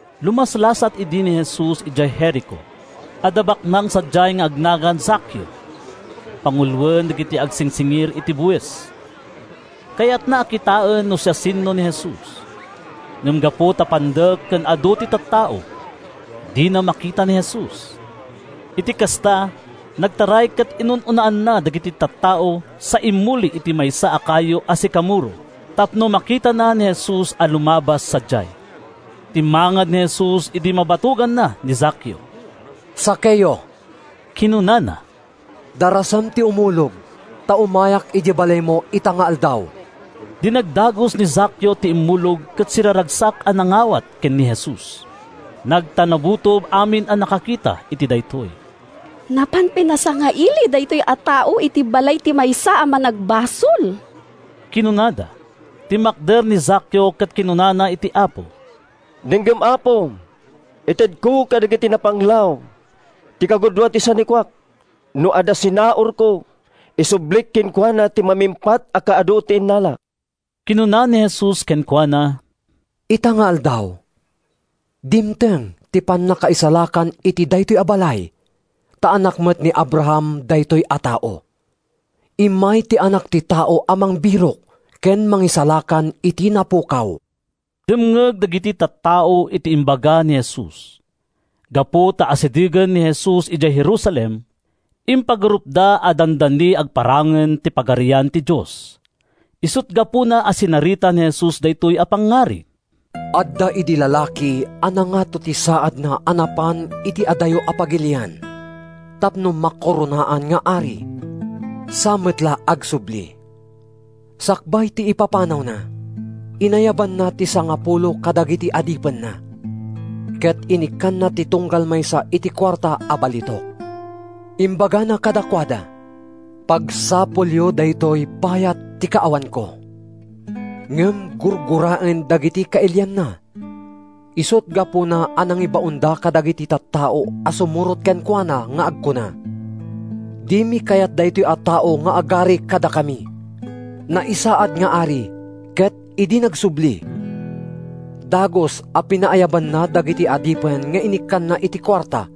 Lumaslasat idi ni Jesus idiay Jerico. Adda baknang sadiay nga agnagan Zakeo. Panguloen dagiti agsingsingir iti buis. Kayatna a kitaen no siasino ni Jesus, ngem gapu ta pandek ken adu ti tattao, dina makita ni Jesus. Iti kasta, nagtaray ket inunaanna dagiti tattao sa immuli iti maysa a kayo a sikamoro tapno makitana ni Jesus a lumabas sadiay. Timmangad ni Jesus idi mabatoganna ni Zakeo. “Zakeo,” kinunana, “darasem ti umulog, ta umayak idiay balaymo ita nga aldaw.” Dinagdagus ni Zakeo ti immulog ket siraragsak a nangawat ken ni Jesus. Nagtanabutob amin a nakakita iti daytoy. “Napan pinasangaili daytoy a tao iti balay ti maysa a managbasol!” kinunada. Timmakder ni Zakeo ket kinunana iti Apo, “Denggem, Apo! Itedko kadagiti napanglaw ti kagudua ti sanikuak. No adda sinaurko, isublik kenkuana iti mamimpat a kaadu ti innalak.” Kinuna ni Jesus kenkuana, “Ita nga aldaw, dimteng ti pannakaisalakan iti daytoy a balay, ta anak met ni Abraham daytoy a tao. Immay ti Anak ti Tao a mangbirok ken mangisalakan iti napukaw.” Dimngeg dagiti tattao iti imbaga ni Jesus. Gapu ta asidegen ni Jesus idiay Jerusalem, impagarupda a dandani agparangen ti Pagarian ti Dios. Isut’ gapuna a sinarita ni Jesus daytoy a pangngarig: “Adda idi lalaki a nangato ti saadna a napan iti adayo a pagilian tapno makoronaan nga ari, sa met la agsubli. Sakbay ti ipapanawna, inayabanna ti sangapulo kadagiti adipenna ket inikkanna ti tunggal maysa iti kuarta a balitok. Imbagana kadakuada, ‘Pagsapulyo daytoy bayat ti kaawanko.’ “Ngem gurguraen dagiti kailianna, isut’ gapuna a nangibaonda kadagiti tattao a sumurot kenkuana nga agkuna, ‘Dimi kayat daytoy a tao nga agari kadakami.’ “Naisaad nga ari ket idi nagsubli, dagus a pinaayabanna dagiti adipen nga inikkanna iti kuarta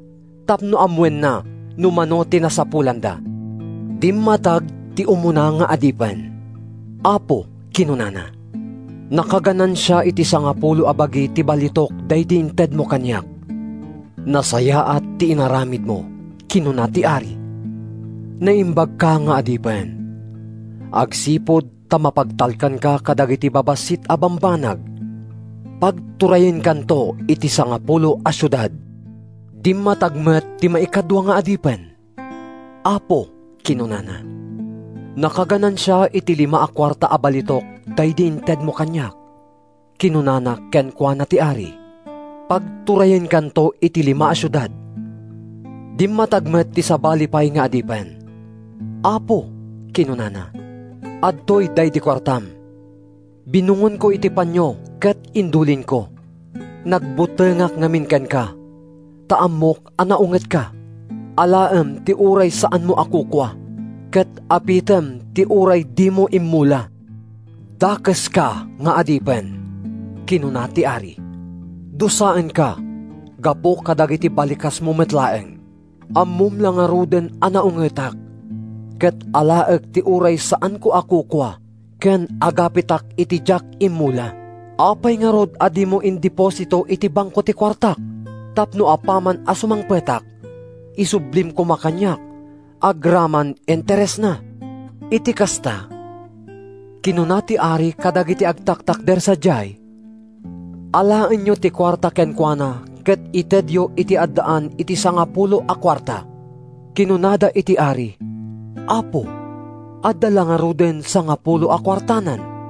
tapno ammoenna no mano ti nasapulanda. “Dimmatag ti umuna nga adipen. ‘Apo,’ kinunana, ‘nakaganansia iti sangapulo a bagi ti balitok daydi intedmo kaniak.’ “‘Nasayaat ti inaramidmo,’ kinuna ti ari. ‘Naimbagka nga adipen. Agsipud ta mapagtalkanka kadagiti babassit a bambanag, pagturayenkanto iti sangapulo a siudad.’ “Dimmatag met ti maikadua nga adipen, ‘Apo,’ kinunana, ‘nakaganansia iti lima a kuarta a balitok daydi intedmo kaniak.’ “Kinuna kenkuana ti ari, ‘Pagturayenkanto iti lima a siudad.’ “Dimmatag met ti sabali pay nga adipen. ‘Apo,’ kinunana, ‘adtoy daydi kuartam. Binungonko iti panio ket indulinko. Nagbutengak ngamin kenka, ta ammok a naungetka. Alaem ti uray saanmo a kukua, ket apitem ti uray dimo immula.’ “‘Dakeska nga adipen!’ kinuna ti ari. ‘Dusaenka gapu kadagiti balikasmo met laeng. Ammom la ngaruden a naungetak, ket alaek ti uray saanko a kukua ken agapitak iti diak immula. Apay ngarud a dimo indeposito iti banko ti kuartak tapno apaman a sumangpetak, isublim koma kaniak agraman interesna?’ “Iti kasta, kinuna ti ari kadagiti agtatakder sadiay, ‘Alaenyo ti kuarta kenkuana ket itedyo iti addaan iti sangapulo a kuarta.’ “Kinunada iti ari, ‘apo, adda la ngarud sangapulo a kuartanan!’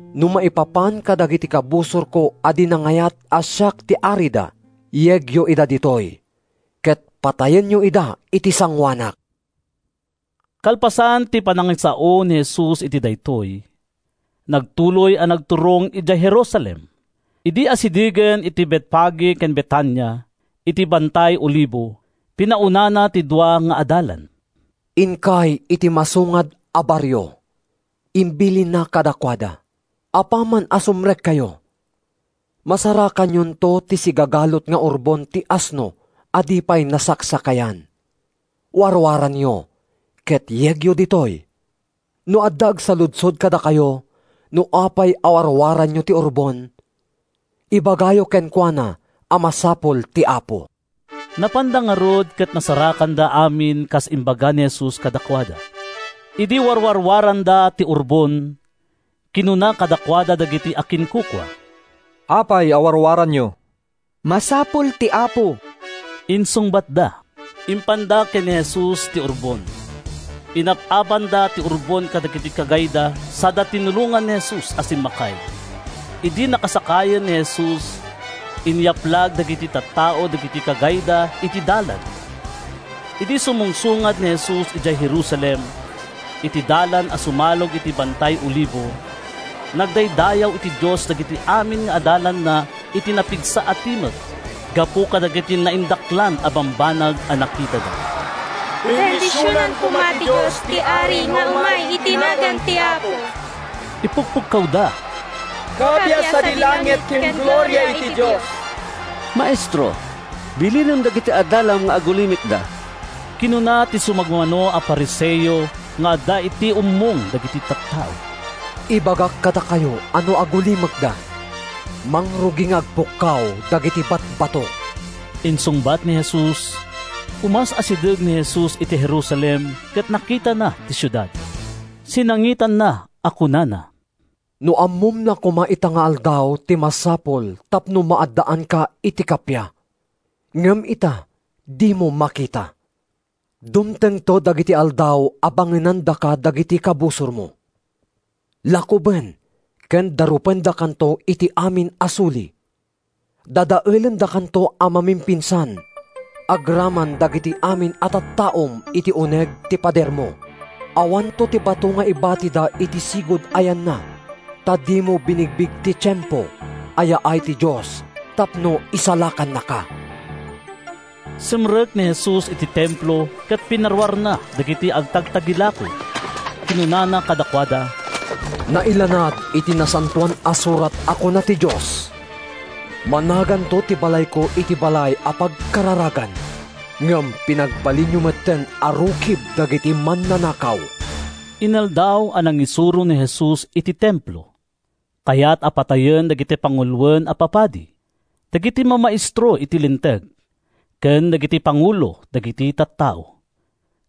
No maipapan kadagiti kabusorko a di nangayat a siak ti arida, yegyo ida ditoy ket patayenyo ida iti sangoanak.’” Kalpasan ti panangisao ni Jesus iti daytoy, nagtuloy a nagturong idiay Jerusalem. Idi asidegen iti Betfage ken Betania, iti Bantay Olivo, pinaunana ti dua nga adalan. “Inkay iti masungad a barrio,” imbilinna kadakuada. “Apaman a sumrekkayo, masarakanyonto ti sigagalut nga urbon ti asno a di pay nasaksakayan. Warwaranyo ket yegyo ditoy. No adda agsaludsod kadakayo no apay a warwaranyo ti urbon, ibagayo kenkuana a masapul ti Apo.” Napanda ngarud ket nasarakanda amin kas imbaga ni Jesus kadakuada. Idi warwarwaranda ti urbon, kinuna kadakuada dagiti akinkukua, “Apay a warwaranyo?” “Masapul ti Apo,” insungbatda. Impanda ken ni Jesus ti urbon. Inap-apanda ti urbon kadagiti kagayda sada tinulongan ni Jesus a simmakay. Idi nakasakayen ni Jesus, inyaplag dagiti tattao dagiti kagayda iti dalan. Idi sumungsungad ni Jesus idiay Jerusalem, iti dalan a sumalog iti Bantay Olivo, nagdaydayaw iti Dios dagiti amin nga adalanna iti napigsa a timek gapu kadagiti naindaklan a bambanag a nakitada. “Bendisionan koma ti Dios ti Ari nga umay iti nagan ti Apo,” ipukpukkawda. “Kappia sadi langit ken gloria iti Dios!” “Maestro, bilinem dagiti adalam nga agulimekda!” kinuna ti sumagmamano a Fariseo nga adda iti ummong dagiti tattao. “Ibagak kadakayo a no agulimekda, mangrugi nga agpukkaw dagiti batbato,” insungbat ni Jesus. Umas-asideg ni Jesus iti Jerusalem ket nakitana ti siudad, sinangitanna a kunana: “No ammom la koma ita nga aldaw ti masapul tapno maaddaanka iti kappia! Ngem ita dimo makita. Dumtengto dagiti aldaw a bangenandaka dagiti kabusormo. Lakuben ken darupendakanto iti amin a suli. Dadaelendakanto a mamimpinsan agraman dagiti amin a tattaom iti uneg ti padermo. Awanto ti bato nga ibatida iti sigud a yanna, ta dimo binigbig ti tiempo a yaay ti Dios tapno isalakannaka!” Simrek ni Jesus iti Templo ket pinaruarna dagiti agtagtagilako. Kinunana kadakuada, “Nailanad iti Nasantoan a Surat a kuna ti Dios, ‘Managanto ti balayko iti balay a pagkararagan.’ Ngem pinagbalinyo metten a rukib dagiti mannanakaw!” Inaldaw a nangisuro ni Jesus iti Templo. Kayat a patayen dagiti panguloen a papadi, dagiti mamaestro iti Linteg, ken dagiti pangulo dagiti tattao.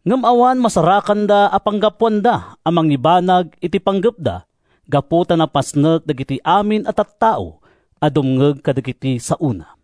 Ngem awan masarakanda a panggapuanda a mangibanag iti panggepda gapu ta napasnek dagiti amin a tattao a dumngeg kadagiti saona.